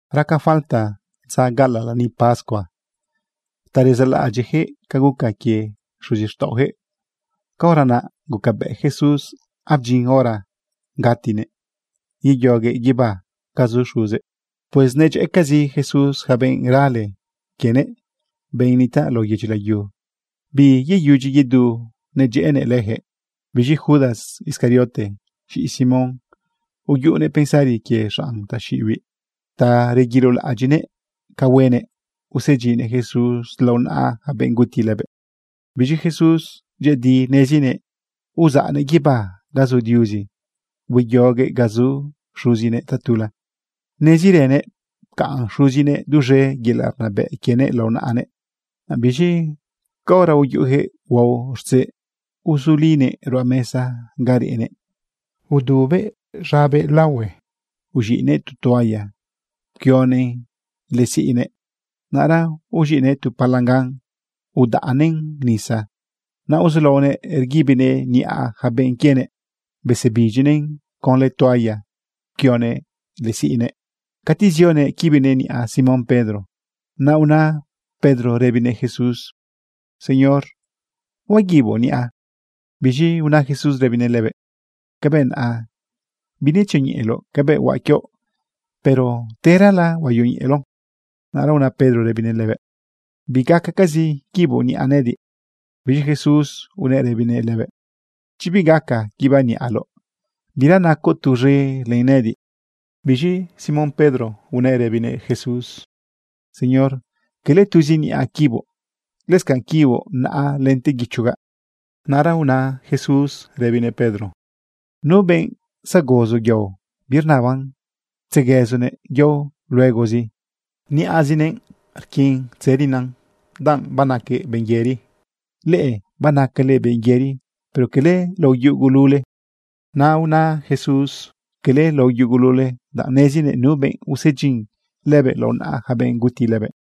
Raca falta dza gaꞌalaꞌ lani pascua ta rezaꞌlaꞌadyiꞌyaquëꞌ ca guca quie xuzixtaꞌoyaquëꞌ. Caora naꞌ gucabëꞌ Jesús abdyin hora gatinëꞌ yeyoguëꞌ guibá ga zu Xuzëꞌ. Pues nedyëꞌëcazi Jesús yaca benꞌ rale quienëꞌ, benꞌ nitaꞌ lao yedyi layu. Biyeyudyi yedu nedyëꞌënëꞌ leyaquëꞌ. Biz̃i Judas Iscariote, z̃iꞌi Simón, uyuꞌunëꞌ pensari quie xanꞌ taxiꞌibiꞌ ta reguilolaꞌadyiꞌnëꞌ ca huenëꞌ usedyinnëꞌ Jesús lao naꞌa yaca benꞌ guti lëbëꞌ. Biz̃i Jesús dyëꞌëdi nezinëꞌ uzaꞌnëꞌ guibá ga zu Diuzi hueyoguëꞌ ga zu Xuzinëꞌ tatula. Nezirënëꞌ pcaꞌn Xuzinëꞌ duz̃e yelaꞌ rnabëꞌ quienëꞌ lao naꞌanëꞌ. Naꞌ biz̃i caora uyuꞌuyaquëꞌ huao rtzeꞌ, uzulinëꞌ ruꞌa mesa ga reꞌnëꞌ, udubëꞌ z̃abëꞌ de laohue, uz̃iꞌnëꞌ tu toalla pquionëꞌn lëꞌë siꞌnëꞌ. Naꞌra uz̃iꞌnëꞌ tu palangan udzaꞌnëꞌn nisa. Naꞌ uzulaonëꞌ rguibinëꞌ niꞌa yaca benꞌ quienëꞌ, besebidyinëꞌn conlë toalla pquionëꞌ lëꞌë siꞌnëꞌ. Cati zionëꞌ quibinëꞌ niꞌa Simón Pedro, naꞌ una Pedro rëbinëꞌ Jesús: ―Señor, ¿huaguiboꞌ niꞌa? Biz̃i una Jesús rëbinëꞌ lëbëꞌ: ―Cabëꞌ naꞌa binetzioñeꞌeloꞌ cabëꞌ huaꞌ quioꞌ, pero terala, huayoñeꞌeloꞌ. Naꞌra una Pedro rëbinëꞌ lëbëꞌ: ―Bigacacazi quiboꞌ niꞌa nëꞌëdiꞌ. Biz̃i Jesús unëꞌ rëbinëꞌ lëbëꞌ: ―Chi bigaca quibaꞌ niꞌaloꞌ, bira nacoꞌ tuz̃e len nëꞌëdiꞌ. Biz̃i Simón Pedro unëꞌ rëbinëꞌ Jesús: ―Señor, cala tuzi niꞌa quiboꞌ, lëscanꞌ quiboꞌ naꞌa lente guichogaꞌ. Naꞌra una Jesús rëbinëꞌ Pedro: ―Nu benꞌ zagozo yao, birnaban tzequëzunëꞌ yao luegozi. Niꞌazinëꞌ rquin tzërina, danꞌ banaquëꞌ benꞌ yëri. Leꞌe banacale benꞌ yëri pero cala lao yugulule. Naꞌ una Jesús: “Cala lao yugulule”, danꞌ nezinëꞌ nu benꞌ usedyin lëbëꞌ lao naꞌa yaca benꞌ guti lëbëꞌ.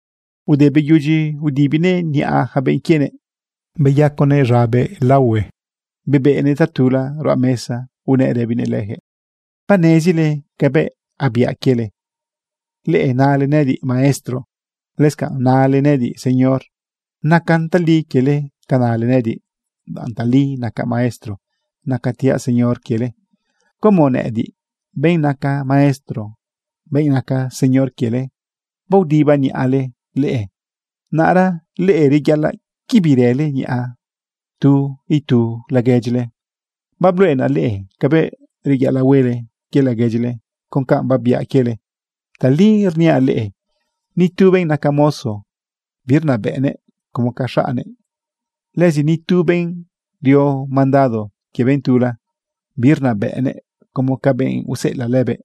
Ude beyudyi udibinëꞌ niꞌa yaca benꞌ quienëꞌ, beyaconëꞌ z̃abëꞌ de laohue, bebeꞌnëꞌ tatula ruꞌa mesa unëꞌ rëbinëꞌ leyaquëꞌ: ―¿Banezile cabëꞌ babiaꞌ quiele? Leꞌe nale nëꞌëdiꞌ: “Maestro”, lëscanꞌ nale nëꞌëdiꞌ: “Señor.” Nacan tali quiele ca nale nëꞌëdiꞌ, danꞌ tali nacaꞌ maestro, nacatiaꞌ Señor quiele. Como nëꞌëdiꞌ, benꞌ naca maestro, benꞌ naca Señor quiele, baodibaꞌ niꞌale leꞌe, naꞌra leꞌe, reyaꞌalaꞌ quibirële niꞌa tu itu laguedyile. Babluꞌenaꞌ leꞌe cabëꞌ reyaꞌalaꞌ huele quie laguedyile con canꞌ babiaꞌ quiele. Tali rniaꞌ leꞌe, ni tu benꞌ naca mozo birnabëꞌnëꞌ como ca xaꞌnnëꞌ. Lëzi ni tu benꞌ rio mandado quie benꞌ tula, birnabëꞌnëꞌ como ca benꞌ useꞌelaꞌ lëbëꞌ.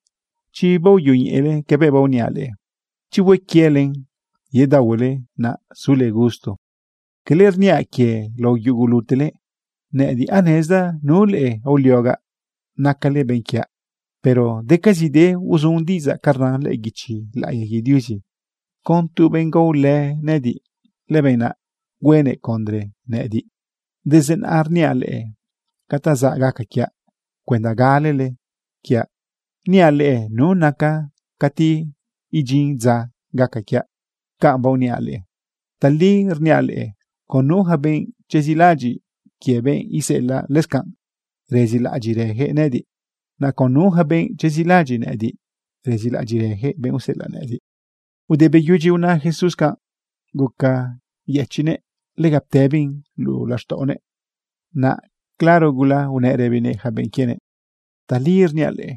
Chi baoyoñeꞌele cabëꞌ baoniaꞌ leꞌe, chi hue quielen, yedaohuele, naꞌ sule gusto. ’Cala rniaꞌ quie lao yugulutele. Nëꞌëdiꞌ anezdaꞌ nu leꞌe aoliogaꞌ nacale benꞌ quiaꞌ. Pero decazide uzun diꞌidzaꞌ ca rnan lëꞌë guichi laꞌiya quie Diuzi: “Con tu benꞌ gaolë nëꞌëdiꞌ, lëbenꞌ naꞌ huenëꞌ condre nëꞌëdiꞌ.” Desde naꞌa rniaꞌ leꞌe ca ta zaꞌ gaca quiaꞌ cuenda galele quiaꞌ niaꞌ leꞌe nu nacaꞌ cati idyin dza gaca quiaꞌ canꞌ baoniaꞌ leꞌe. Tali rniaꞌ leꞌe, con nu yaca benꞌ chezilaꞌadyiꞌ quie benꞌ iseꞌelaꞌ, lëscanꞌ rezilaꞌadyiꞌrëyaquëꞌ nëꞌëdiꞌ. Naꞌ con nu yaca benꞌ chezilaꞌadyiꞌ nëꞌëdiꞌ, rezilaꞌadyiꞌrëyaquëꞌ benꞌ useꞌelaꞌ nëꞌëdiꞌ. Ude beyudyi una Jesús canꞌ, guca yëchiꞌnëꞌ, lega ptëbin luꞌu laxtaꞌonëꞌ. Naꞌ claro gula unëꞌ rëbinëꞌ yaca benꞌ quienëꞌ: ―Tali rniaꞌ leꞌe,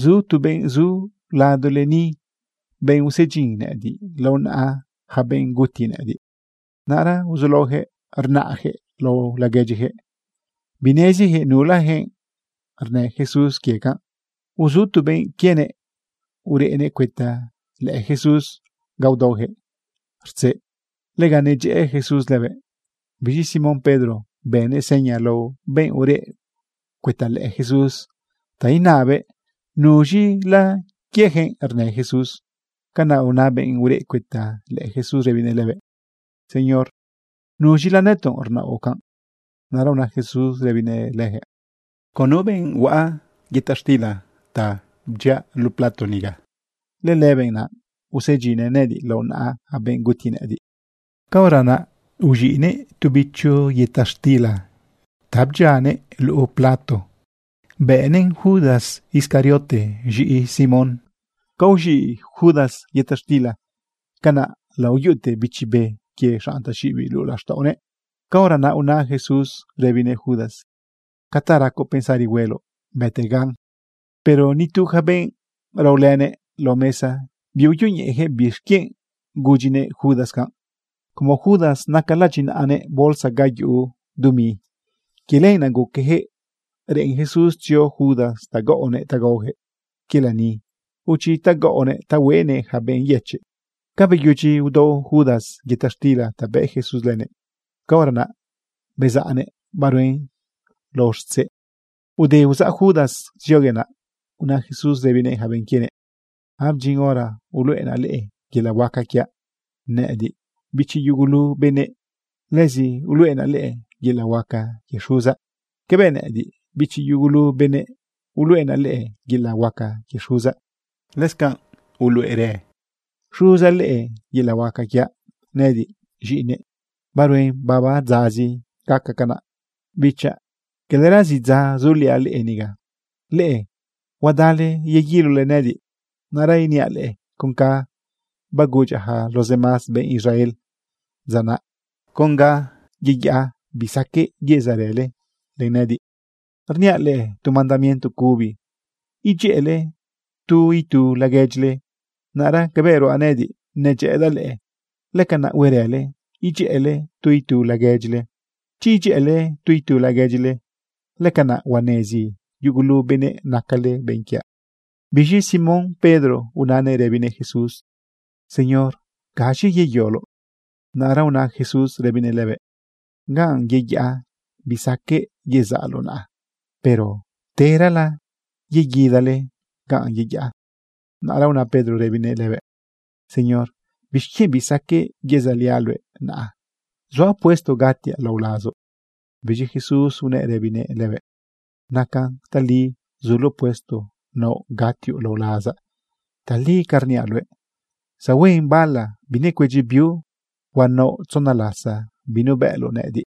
zu tu benꞌ zu ladole ni, benꞌ usedyin nëꞌëdiꞌ lao naꞌa yaca benꞌ guti nëꞌëdiꞌ. Naꞌra uzulaoyaquëꞌ rnaꞌyaquëꞌ lao laguedyiyaquëꞌ. Bineziyaquëꞌ nulayaquëꞌ rnë Jesús quie canꞌ. Uzu tu benꞌ quienëꞌ ureꞌnëꞌ cuëta lëꞌë Jesús ga udaoyaquëꞌ rtzeꞌ. Lega nedyëꞌë Jesús lëbëꞌ. Biz̃i Simón Pedro bënëꞌ seña lao benꞌ ureꞌ cuëta lëꞌë Jesús ta inabëꞌ nuz̃ila quieyaquëꞌ rnë Jesús. Canaꞌ una benꞌ ureꞌ cuëta lëꞌë Jesús rëbinëꞌ lëbëꞌ: ―¿Señor, nuz̃ila nëtoꞌ rnaoꞌ canꞌ? Naꞌra una Jesús rëbinëꞌ leyaquëꞌ: ―Con nu benꞌ huaꞌa yëta xtila bdyiaꞌ luꞌu plato niga, lëlëbenꞌ naꞌ usedyinnëꞌ nëꞌëdiꞌ lao naꞌa yaca benꞌ guti nëꞌëdiꞌ. Caora naꞌ uz̃iꞌnëꞌ tu bicho yëta xtila ta bdyianëꞌ luꞌu plato bëꞌnëꞌn Judas Iscariote, z̃iꞌi Simón. Ca uz̃iꞌ Judas yëta xtila, canaꞌ layuꞌute bichi be quie xanꞌ taxiꞌibiꞌ luꞌu laxtaꞌonëꞌ. Caora naꞌ una Jesús rëbinëꞌ Judas: ―Ca ta racoꞌ pensari hueloꞌ, bëtegan. Pero nitu yaca benꞌ raolënëꞌ lao mesa biuyoñeꞌeyaquëꞌ bixquienꞌ gudyinëꞌ Judas canꞌ. Como Judas naca ladyinaꞌanëꞌ bolsa ga yuꞌu dumi, quie lenaꞌ guqueyaquëꞌ reꞌen Jesús tzio Judas ta gaꞌonëꞌ ta gaoyaquëꞌ quie lani o chi ta gaꞌonëꞌ ta hueꞌnëꞌ yaca benꞌ yëchiꞌ. Ca beyudyi udao Judas yëta xtila ta bëꞌ Jesús lënëꞌ, caora naꞌ bezaꞌnëꞌ baruen lao rtzeꞌ. Ude uzaꞌ Judas zioguëꞌ, naꞌ una Jesús rëbinëꞌ yaca benꞌ quienëꞌ: ―Abdyin hora uluꞌenaꞌ leꞌe yelaꞌ huaca quiaꞌ, nëꞌëdiꞌ bichi yugulu benëꞌ. Lëzi uluꞌenaꞌ leꞌe yelaꞌ huaca quie Xuzaꞌ. Cabëꞌ nëꞌëdiꞌ bichi yugulu benëꞌ, uluꞌenaꞌ leꞌe yelaꞌ huaca quie Xuzaꞌ, lëscanꞌ uluꞌerë Xuzaꞌ leꞌe yelaꞌ huaca quiaꞌ nëꞌëdiꞌ z̃iꞌinëꞌ. Baruen baba dzazi gaca canaꞌ. Bichaꞌ, calara zidza zuliaꞌ leꞌe niga. Leꞌe huadale yeguilole nëꞌëdiꞌ. Naꞌra iniaꞌ leꞌe con canꞌ bagudyaꞌ yaca los demás benꞌ Israel dza naꞌ: Con ganꞌ yeyaꞌa, bisaqueꞌ yezaꞌrële len nëꞌëdiꞌ. Rniaꞌ leꞌe tu mandamiento cubi: Idyëꞌële tu itu laguedyile. Naꞌra cabëꞌ ruaꞌ nëꞌëdiꞌ, nedyëꞌëdaꞌ leꞌe, lëcanaꞌ huerële, idyëꞌële tu itu laguedyile. Chi idyëꞌële tu itu laguedyile, lëcanaꞌ huanezi yugulu benëꞌ nacale benꞌ quiaꞌ. Biz̃i Simón Pedro unanëꞌ rëbinëꞌ Jesús: ―Señor, ¿gaz̃i yeyoloꞌ? Naꞌra una Jesús rëbinëꞌ lëbëꞌ: ―Ganꞌ yeyaꞌa bisaqueꞌ yezaꞌloꞌ naꞌa. Pero terala yeguidale ganꞌ yeyaꞌa. Naꞌra una Pedro rëbinëꞌ lëbëꞌ: ―Señor, ¿bixquienꞌ bisaqueꞌ yezaꞌliaꞌ luëꞌ naꞌa? Zuaꞌ puesto gatiaꞌ lao lazoꞌ. Biz̃i Jesús unëꞌ rëbinëꞌ lëbëꞌ: ―¿Nacan tali zuloꞌ puesto naoꞌ gatioꞌ lao lazaꞌ? Tali ca rniaꞌ luëꞌ, zahuen bala binecuedyi biu, huanaoꞌ tzona lasa binubëꞌloꞌ nëꞌëdiꞌ.